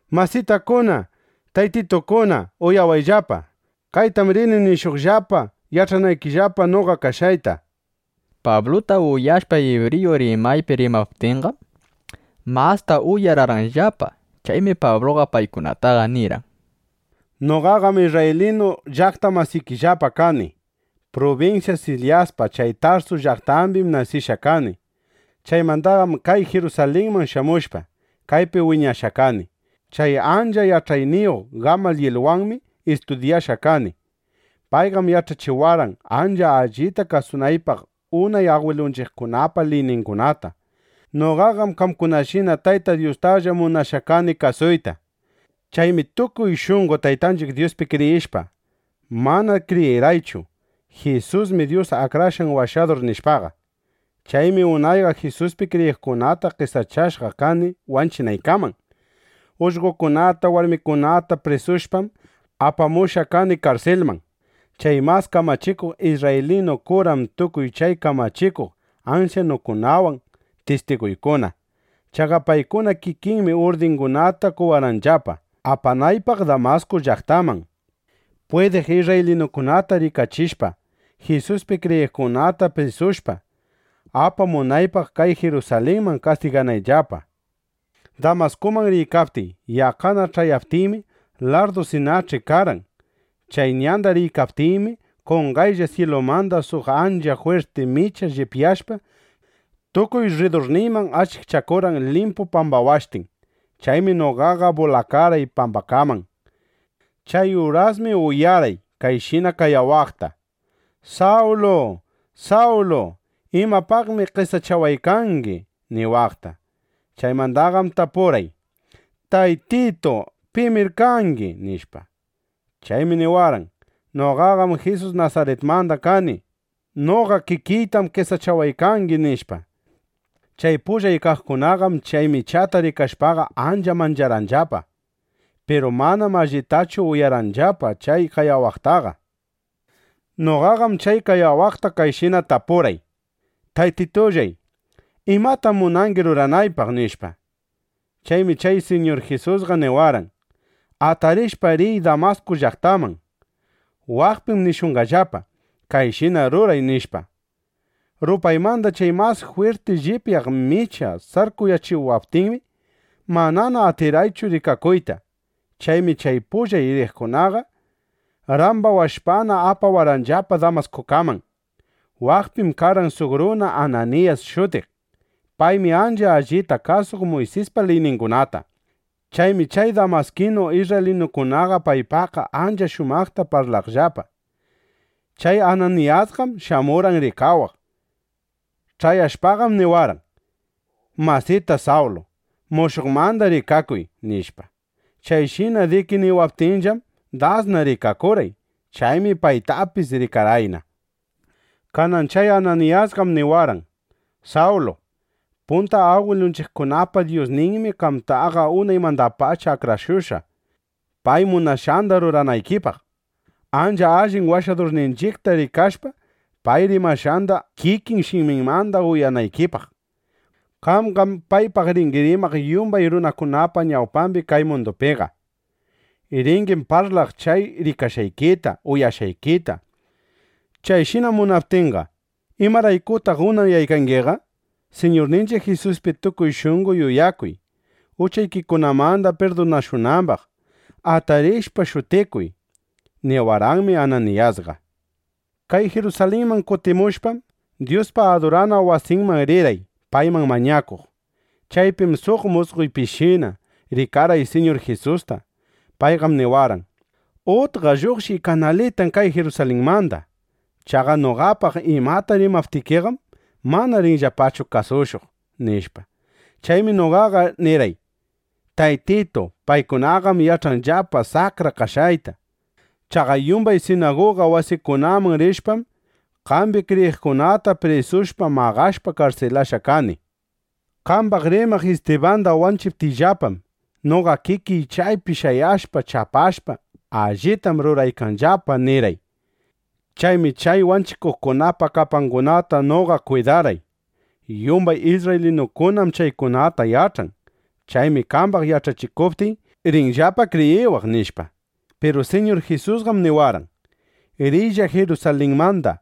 —Masitakuna, taytitukuna, uyawayllapa. Kaytam rini nishuqllapa yach'anaykillapa noqa kashqayta, nishpa. Pabluta uyashpa ibriyu rimaypi rimaptinqam, masta uyararqanllapa. Chaymi Pabluqa paykunataqa nirqan: —Noqaqam isrraylinu llaqta masikillapa kani. Prubinsya Silisyapa chay Tarsu llaqtambim nasishqa kani. Chaymandaqam kay Jirusalinman shamushpa, kaypi wiñashqa kani. Chay ancha yach'ayniyuq Gamayilwanmi istudyashqa kani. Payqam yach'achiwarqan, ancha allita kasunaypaq unay agwilunchiqkunapa liyningunata. Noqaqam qamkunashina Tayta Dyustalla munashqa kani kasuyta. Chaymi tukuy shunqo Taytanchiq Dyuspi kriyishpa, (mana kriyirqaychu: Jisusmi Dyus Akrashqan Washadur, nishpaqa.) Chaymi unayqa Jisuspi kriyiqkunata qesachashqa kani wanchinaykaman. Ullqokunata, warmikunata prisushpam, apamushqa kani karsilman. Chay mas kamachikuq isrraylinu kuram tukuy chay kamachikuq ansyanukunawan tistiguykuna. Chaqa paykuna kikinmi urdingunata qowarqanllapa, apanaypaq Damasku llaqtaman, pwidiq isrraylinukunata rikachishpa, Jisuspi kriyiqkunata prisushpa, apamunaypaq kay Jirusalinman kastiganayllapa, nishpa. ’Damaskuman riykaptiy, yaqqana ch'ayaptiymi, larrdusinach'i karqan. Chay ñanda riykaptiymi, qonqaylla syilumanda suq ancha jwirti micha llipyashpa, tukuy rridurniyman achikchakurqan limpu pambawashtin. Chaymi noqaqa bulakarqay pambakaman. Chay urasmi uyarqay kayshina qayawaqta: “¡Sawlu! ¡Sawlu! ¿Imapaqmi qesachawaykangi?” niwaqta. Chaymandaqam tapurqay: “¿Taytitu, pimir kangi?” nishpa. Chaymi niwarqan: “Noqam Jisus Nasaritmanda kani. ¡Noqa kikiytam qesachawaykangi!” nishpa. Chay pullay kaqkunaqam chay michata rikashpaqa, ancha mancharqanllapa. Piru manam allitachu uyarqanllapa chay qayawaqtaqa. Noqaqam chay qayawaqta kayshina tapurqay: “Taytitullay, ¿imatam munangi ruranaypaq?” nishpa. Chaymi chay Siñur Jisusqa niwarqan: “Atarishpa, riy Damasku llaqtaman. Waqpim nishunqallapa: ‘Kayshina ruray’”, nishpa. Rupaymanda chay mas jwirti llipyaq micha sarkuyachiwaptinmi, manana atirqaychu rikakuyta. Chaymi chay pullay riqkunaqa, rambawashpana, apawarqanllapa Damaskuman. ’Waqpim karqan suq runa Ananiyas shutiq. Paymi ancha allita kasuq Muysispa liyningunata. Chaymi chay damaskinu isrraylinukunaqa paypaqqa ancha shumaqta parlaqllapa. Chay Ananiyasqam shamurqan rikawaq. Ch'ayashpaqam niwarqan: “Masita Sawlu, mushuqmanda rikakuy”, nishpa. Chayshina diki niwaptinllam, dasna rikakurqay. Chaymi paytapis rikarqayna. Kanan chay Ananiyasqam niwarqan: “Sawlu, punta agwilunchiqkunapa Dyusninmi qamtaqa unaymandapacha akrashushqa, pay munashqanda ruranaykipaq, ancha allin Washadurninchiqta rikashpa, pay rimashqanda kikin shiminmanda uyanaykipaq. Qamqam paypaq ringi rimaq yumbay runakunapa ñawpambi kay mundupiqa. Ringim parlaq chay rikashqaykita, uyashqaykita. Chayshina munaptinqa ¿imaraykutaq unayaykangiqa? Siñurninchiq Jisuspi tukuy shunqo yuyakuy, uchaykikunamanda pirdunashunambaq. Atarishpa, shutikuy”, niwarqanmi Ananiyasqa. ’Kay Jirusalinman kutimushpam, Dyuspa adurana wasinman rirqay, payman mañakuq. Chaypim suq musqoypishina rikarqay Siñur Jisusta. Payqam niwarqan: “Utqa lluqshiy kanalitan kay Jirusalinmanda. Chaqa noqapaq imata rimaptikiqam, mana rinllapachu kasushuq”, nishpa. Chaymi noqaqa nirqay: “Taytitu, paykunaqam yach'anllapa saqra kashqayta. Chaqa yumbay sinaguga wasikunaman rishpam, qambi kriyiqkunata prisushpa, maqashpa, karsilashqa kani. Qambaq rimaq Istibanda wanchiptinllapam, noqa kikiy chaypi shayashpa, chapashpa, ‘Allitam ruraykanllapa’ nirqay. (Chaymi chay wanchikuqkunapa kapangunata noqa kwidarqay. Yumbay isrraylinukunam chaykunata yach'an. Chaymi qambaq yach'achikuptiy, rinllapa kriyiwaq)”, nishpa. Piru Siñur Jisusqam niwarqan: “Riylla Jirusalinmanda.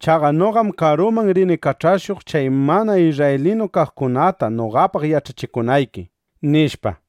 Chaqa noqam karuman rini kach'ashuq chay mana isrraylinu kaqkunata noqapaq yach'achinayki”, nishpa.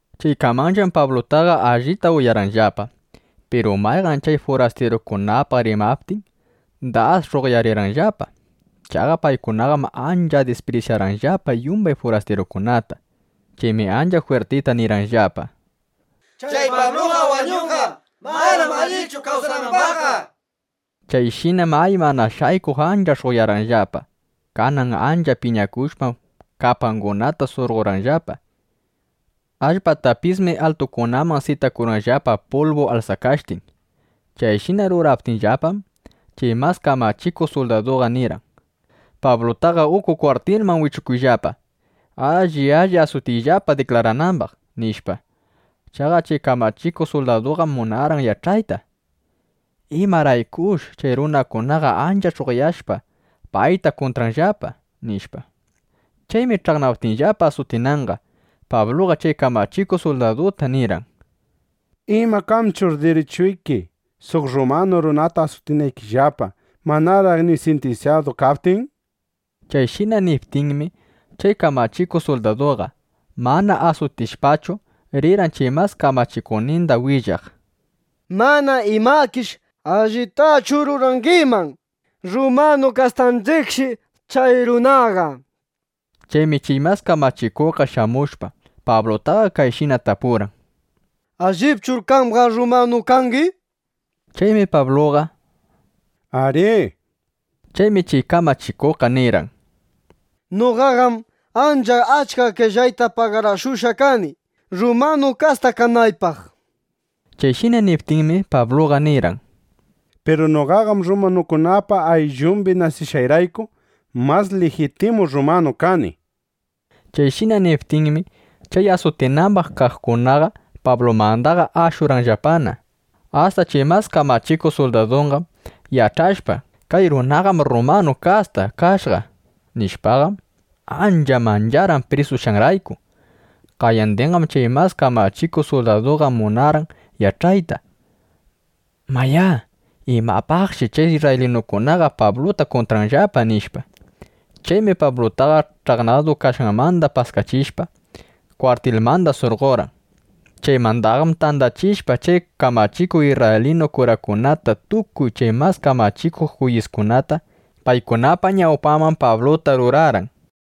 Chaykamanllam Pablutaqa allita uyarqanllapa. Piru payqam chay furastirukunapaq rimaptin, das sh'uqyarirqanllapa. (Chaqa paykunaqam ancha disprisyarqanllapa yumban furastirukunata.) Chaymi ancha jwirtita nirqanllapa: —¡Chay Pabluqa wañunqa! ¡Manam allichu kawsanambaqqa! nishpa. Chayshinam, ay, mana shaykuq ancha sh'uqyarqanllapa. Kanan ancha piñakushpam, kapangunata surqorqanllapa. Allpatapismi altukunaman sitakurqanllapa pulbu alsakashtin. Chayshina ruraptinllapam, chay mas kamachikuq suldaduqa nirqan: —Pablutaqa uku kwartilman wichuyllapa. Alli alli asutiyllapa diklaranambaq, nishpa. Chaqa chay kamachikuq suldaduqam munarqan yach'ayta: ¿Imaraykush chay runakunaqa ancha sh'uqyashpa, payta kuntranllapa? nishpa. Chaymi ch'aqnaptinllapa asutinanqa, Pabluqa chay kamachikuq suldaduta nirqan: —¿Ima kanchur dirichuyki suq rrumanu runata asutinaykillapa, manaraq ni sintinsyadu kaptin? Chayshina niptinmi, chay kamachikuq suldaduqa, mana asutishpachu, rirqan chay mas kamachikuqninda willaq: —Mana imakish allitachu rurangiman. ¡Rrumanu kastanchiqshi chay runaqa! nishpa. Chaymi chay mas kamachikuqqa shamushpa, Pablutaqa kayshina tapurqan: —¿Allipchur qamqa rrumanu kangi? nishpa. Chaymi Pabluqa “Arí” nirqan. Chaymi chay kamachikuqqa nirqan: —Noqaqam ancha achka qellayta pagarakushqa kani, rrumanu kasta kanaypaq. Chayshina niptinmi, Pabluqa nirqan: —Piru noqaqam rrumanukunapa ayllumbi nasishqayrayku, mas lijitimu rrumanu kani. Chayshina niptinmi, chay asutinambaq kaqkunaqa Pablumandaqa ashurqanllapana. Asta chay mas kamachikuq suldaduqam yach'ashpa: “Kay runaqam rrumanu kasta kashqa” nishpaqam, ancha mancharqan, prisushqanrayku. Qayandinqam chay mas kamachikuq suldaduqa munarqan yach'ayta: Mayá, imapaqshi chay isrraylinukunaqa Pabluta kuntranllapa, nishpa. Chaymi Pablutaqa ch'aqnadu kashqanmanda paskachishpa, kwartilmanda surqorqan. Chaymandaqam tandachishpa chay kamachikuq isrraylinu kurakunata tukuy chay mas kamachikuq juyiskunata, paykunapa ñawpanman Pabluta rurarqan.